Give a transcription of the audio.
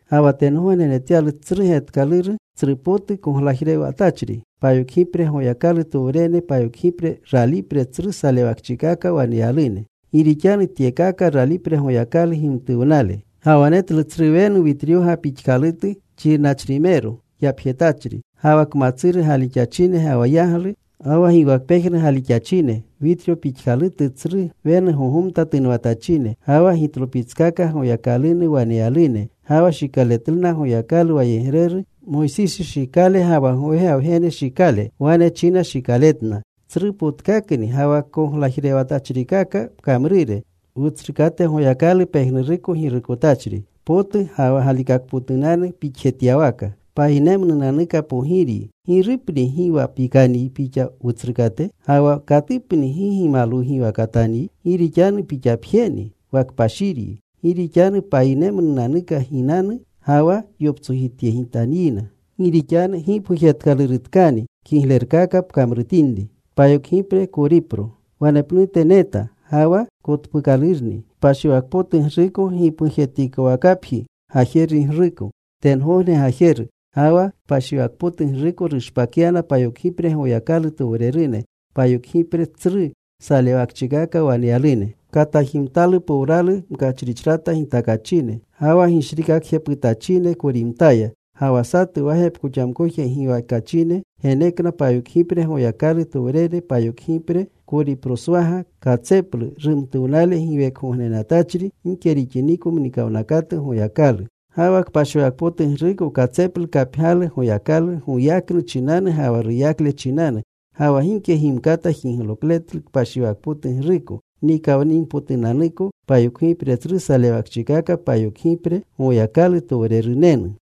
Ga wa tengogne netyalu satu getkaluru, tsrupotu koglajrewatachri. Payokgipre Goyakalutowrene payokgipre ralipre tsru salewakchikaka waneyalune. Gi rixanu tyekakaya ralipreta Goyakalu gimtuwnale. Ga wa netlu tsru wenu witryoga pixkalutu xirnachrimero yapjetachri. Ga wa kmatsuru gaalixachine, ga wa yaglu, ga wa giwakpejnu gaalixachine, witryo pixkalutu tsru wenu gogomta tunwatachine. Ga wa gitlopitskaka Goyakalunu waneyalune. Ga wa shikaletluna Goyakalu wayegreru Moysisi shikale ga wa gowega Wgene shikale. Wane china shikaletna: Tsrupotkakni ga wa koglajrewatachrikaka pkamrure, Wutsrukate Goyakalu, pejnuruko Girukotachri. Potuko potu ga wa galikakpotunanu pixjetyawaka. Payinemnunanuka Pogiryi. ¿Girupni gi wa pikanyi Pixa, Wutsrukate? ¿Ga wa katupni gi gimalwugiwakatanyi? Gi rixanu Pixapjeni wa kpashiryi. Gi rixanu payinerumnunanuka ginanu ga wa yoptsojityegitanyina. Gi rixanu gipgujetkalurutkani kiglerkaka pkamrutinri. Wanepnute neta. Ga wa kotpuukalurni kpashiwakpotugruko, gipgujtatikowakapji gajerugruko tengogne gajeru. Ga wa kpashiwakpotugruko rushpakyana payokgipre Goyakalutowrene, payokgipre tsru salewakchikaka waneyalune. Katajimtalu powralu mkachrichrata gitakachine. Ga wa gishrikakjeputachine korimtaya. Ga wa satu wa gepkoxamkoje giwekachine genekna payokgipre Goyakalutowrene payokgipre koriproswaga katseplu rumtuwnale giwekgognenatachri gike rixiniko mnikawnakatu Goyakalu. Ga wa kpashiwakpotugruko katseplu kapgyalu Goyakalu goyaknu chinanu ga wa ruyakle chinanu. Ga wa gike gimkata jiglokletlu kpashiwakpotugruko nikawninpotunanuko payokgipre tsru salewakchikaka payokgipre Goyakalutowrerunenu.